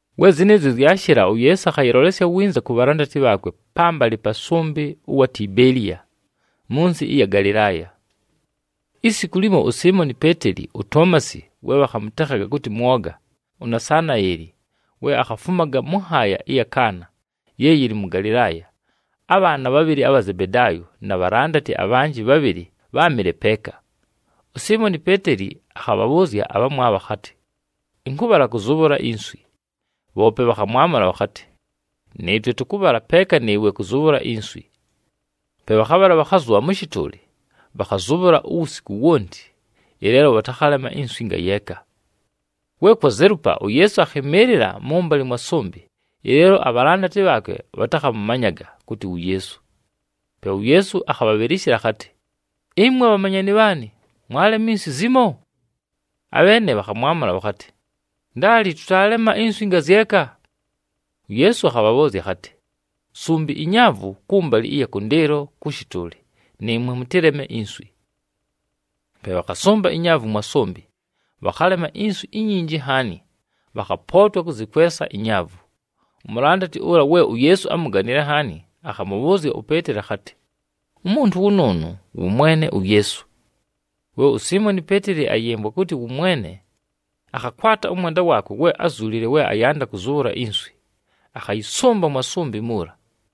We zɨnɨɨzyo zyashɨla, uYeesu akhayɨlolesya winza ku bhalandati bhaakwe pambalɨ pa sʉmbɨ ʉwa Tibeeliya, mʉ nsɨ ɨya mʉ Galɨlaaya. Isiku limo, uSiimoni Peeteli, uToomasi we bhakhamʉtekhaga kʉtɨ Mwoga, uNasanaeli we akhafumaga mʉ nhaaya ɨya mʉ Kaana ye yɨlɨ mʉ Galɨlaaya, abhaana bhabhɨlɨ abha Zebedaayo na bhalandati abhanjɨ bhabhɨlɨ bháamɨle peeka. USiimoni Peeteli akhabhabhʉʉzya abhamwabho akhatɨ, “Ɨnkʉbhala kʉzʉbhʉla inswi.” Bhoope bhakhamwamʉla bhakhatɨ, “Nɨɨtwe tʉkʉbhala peeka nɨɨwe kʉzʉbhʉla inswi.” Pe bhakhabhala, bhakhazʉbha mʉ shɨtʉʉlɨ, bhakhazʉbhʉla wusiku wonti, ɨleelo bhatakhalema inswi ngayeeka. We kwazelupa, uYeesu akhɨmɨɨlɨla mʉ mʉmbalɨ mwa sʉmbɨ, ɨleelo abhalandati bhaakwe bhatakhamʉmanyaga kʉtɨ wu Yeesu. Pe uYeesu akhabhabhɨlɨshɨla akhatɨ, “Ɨmwe bhamanyani bhaanɨ, mwalema inswi zimo?” Abheene bhakhamwamʉla bhakhatɨ, “Ndaali, tʉtaalema inswi ngazyeka.” UYeesu akhabhabhʉʉzya akhatɨ, “Sumbi inyaavu kʉmbalɨ ɨya kʉndɨɨlo kʉ shɨtʉʉlɨ, nɨɨmwe mʉtɨleme inswi.” Pe bhakhasʉmba inyaavu mwa sʉmbɨ, bhakhalema inswi inyinji nhaani, bhakhapootwa kʉzɨkwesa inyaavu. Umulandati ʉla we uYeesu ámuganile nhaani, akhamʉbhʉʉzya uPeeteli akhatɨ, “Umuntu wʉnʉʉnʉ wʉ Mwene uYeesu!” We uSiimoni Peeteli ayɨmvwa kʉtɨ wʉ Mwene, akhakwata ʉmwenda waakwe we ázuulile we ayanda kʉzʉbhʉla inswi, akhayɨsʉmba mwa sʉmbɨ muula.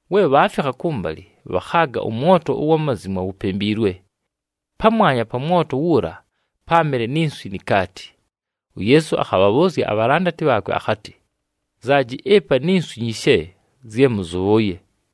We bhaafikha kʉmbalɨ, bhakhaaga ʉmwoto ʉwa mazimwa wupembiilwe. Pamwanya pa mwoto wuula páamɨle ni nswi ni kaati. UYeesu akhabhabhʉʉzya abhalandati bhaakwe akhatɨ, “Nzaaji ɨpa ni nswi nyishe zye mʉzʉbhʉʉye.”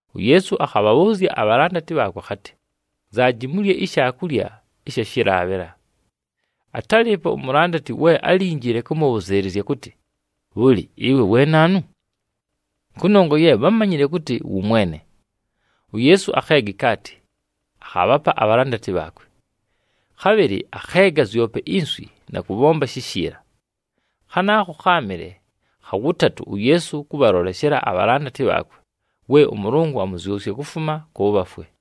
UYeesu akhabhabhʉʉzya abhalandati bhaakwe akhatɨ, “Nzaaji mulye ishaakulya ɨsha shɨlaabhɨla.” Atálɨɨpo umulandati we álinjile kʉmʉbhʉzɨɨlɨzya kʉtɨ, “Bhʉlɨ, ɨwe we naanu?” Kʉnongwa ye bhámanyile kʉtɨ wʉ Mwene. UYeesu akheega ikaati, akhaabhapa abhalandati bhaakwe. Khabhɨlɨ akheega zyope inswi na kʉbhomba shishiila. Khanaakho kháamɨle kha wʉtatʉ uYeesu kʉbhaloleshela abhalandati bhaakwe, we ʉMʉlʉngʉ amʉzyʉsya kufuma kʉ bhafwe.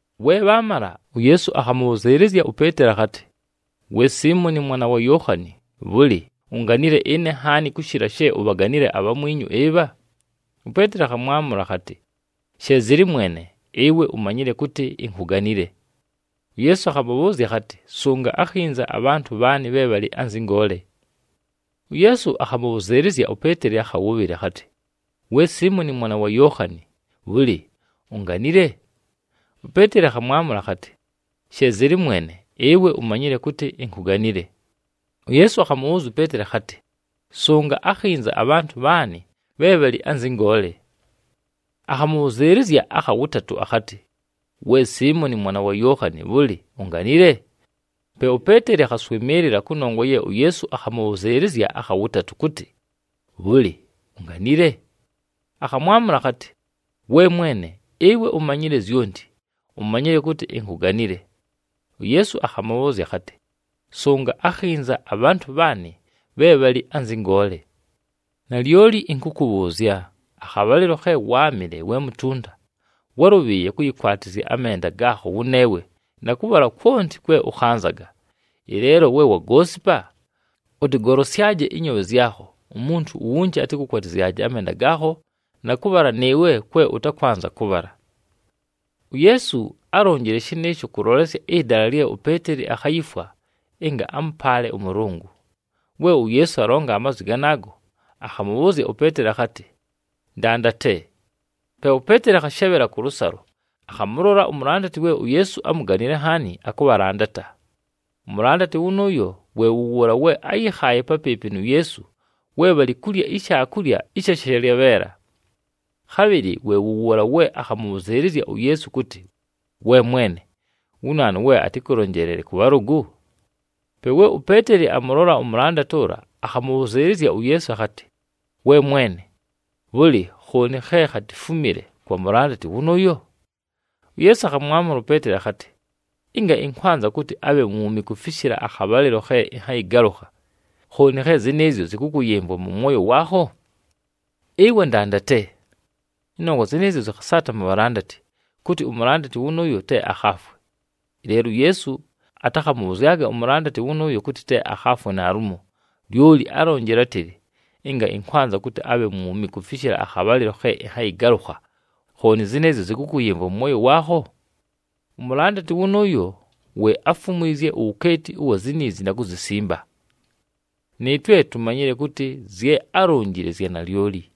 We bhaamala, uYeesu akhamʉbhʉzɨɨlɨzya uPeeteli akhatɨ, “We Siimoni mwana wa Yookhani, bhʉlɨ, unganile ɨne nhaani kʉshɨla she ubhaganile abhamwinyu ɨbha?” UPeeteli akhamwamʉla akhatɨ, “She zɨlɨ Mwene, ɨwe umanyile kʉtɨ inkuganile.” UYeesu akhamʉbhʉʉzya akhatɨ, “Sʉnga akhinza abhantʉ bhaanɨ bhe bhalɨ anzɨ ngoole.” UYeesu akhamʉbhʉzɨɨlɨzya uPeeteli akha wʉbhɨlɨ akhatɨ, “We Siimoni mwana wa Yookhani, bhʉlɨ, unganile?” UPeeteli akhamwamʉla akhatɨ, “She zɨlɨ Mwene, ɨwe umanyile kʉtɨ inkuganile.” UYeesu akhamʉbhʉʉzya uPeeteli akhatɨ, “Sʉnga akhinza abhantʉ bhaanɨ bhe bhalɨ anzɨ ngoole.” Akhamʉbhʉzɨɨlɨzya akha wʉtatʉ akhatɨ, “We Siimoni mwana wa Yookhani, bhʉlɨ, unganile?” Pe uPeeteli akhaswɨmɨɨlɨla kʉnongwa ye uYeesu akhamʉbhʉzɨɨlɨzya akha wʉtatʉ, kʉtɨ, “Bhʉlɨ, unganile?” Akhamwamʉla akhatɨ, “We Mwene, ɨwe umanyile zyonti. Umanyile kʉtɨ inkuganile.” UYeesu akhamʉbhʉʉzya akhatɨ, “Sʉnga akhinza abhantʉ bhaanɨ bhe bhalɨ anzɨ ngoole. Nalyoli ɨnkʉkʉbhʉʉzya, akhabhalɨlo khe wáamɨle we mutunta, wálʉbhɨɨye kʉyɨkwatɨzya amenda gaakho wʉneewe na kʉbhala kwonti kwe ʉkhanzaga. Ɨleelo we wagoosipa, ʉtɨgolosyaje ɨnyoobhe zyakho, umuntu uwunji atɨkʉkwatɨzyaje amenda gaakho na kʉbhala nɨɨwe kwe ʉtakwanza kʉbhala.” UYeesu álonjile shɨnɨɨsho kʉlolesya ɨdala lye uPeeteli akhayifwa ɨnga amʉpaale ʉMʉlʉngʉ. We uYeesu alonga amazwi ganaago, akhamʉbhʉʉzya uPeeteli akhatɨ, “Ndandate.” Pe uPeeteli akhashebhela kʉlʉsalo, akhamʉlola umulandati we uYeesu ámuganile nhaani, akʉbhalandata. Umulandati wʉnʉʉyo we wʉ wʉʉla we áyɨkhaaye papɨɨpɨ nu Yeesu we bhalɨ kulya ishaakulya ɨsha shalyabheela. Khabhɨlɨ we wʉ wʉʉla we akhamʉbhʉzɨɨlɨzya uYeesu kʉtɨ, “We Mwene, wu naanu we atɨkʉlonjeelele kʉ bhalʉgʉ?” Pe we uPeeteli amʉlola umulandati ʉla, akhamʉbhʉzɨɨlɨzya uYeesu akhatɨ, “We Mwene, bhʉlɨ, khooni khe khatifumile kwa mulandati wʉnʉʉyo?” UYeesu akhamwamʉla uPeeteli akhatɨ, “Ɨnga ɨnkwanza kʉtɨ abhe mwumi kufishila akhabhalɨlo khe ɨnhayɨgalʉkha, khooni khe zɨnɨɨzyo zɨkʉkʉyɨmvwa mʉ mwoyo waakho? Ɨwe ndandate.” Ɨnongwa zɨnɨɨzyo zɨkhasaata mu bhalandati, kʉtɨ umulandati wʉnʉʉyo te akhaafwe. Ɨleelo uYeesu atakhamʉbhʉzyaga umulandati wʉnʉʉyo kʉtɨ te akhaafwe naalumo, lyoli álonjile átɨlɨ, “Ɨnga ɨnkwanza kʉtɨ abhe mwumi kufishila akhabhalɨlo khe ɨnhayɨgalʉkha, khooni zɨnɨɨzyo zɨkʉkʉyɨmvwa mʉ mwoyo waakho?” Umulandati wʉnʉʉyo we áfumwizye uwukeeti ʉwa ziniizi na kuzisimba. Nɨɨtwe tumanyile kʉtɨ zye álonjile zya nalyoli.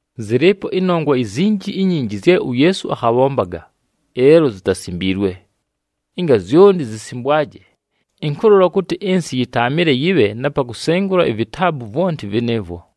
Zɨlɨɨpo ɨnongwa izinji inyinji zye uYeesu akhabhombaga, ɨleelo zitasimbiilwe. Ɨnga zyonti zisimbwaje, ɨnkʉlola kʉtɨ ɨnsɨ yɨtaamɨle yɨbhe na pa kusengula ivitaabu vwonti vɨnɨɨvwo.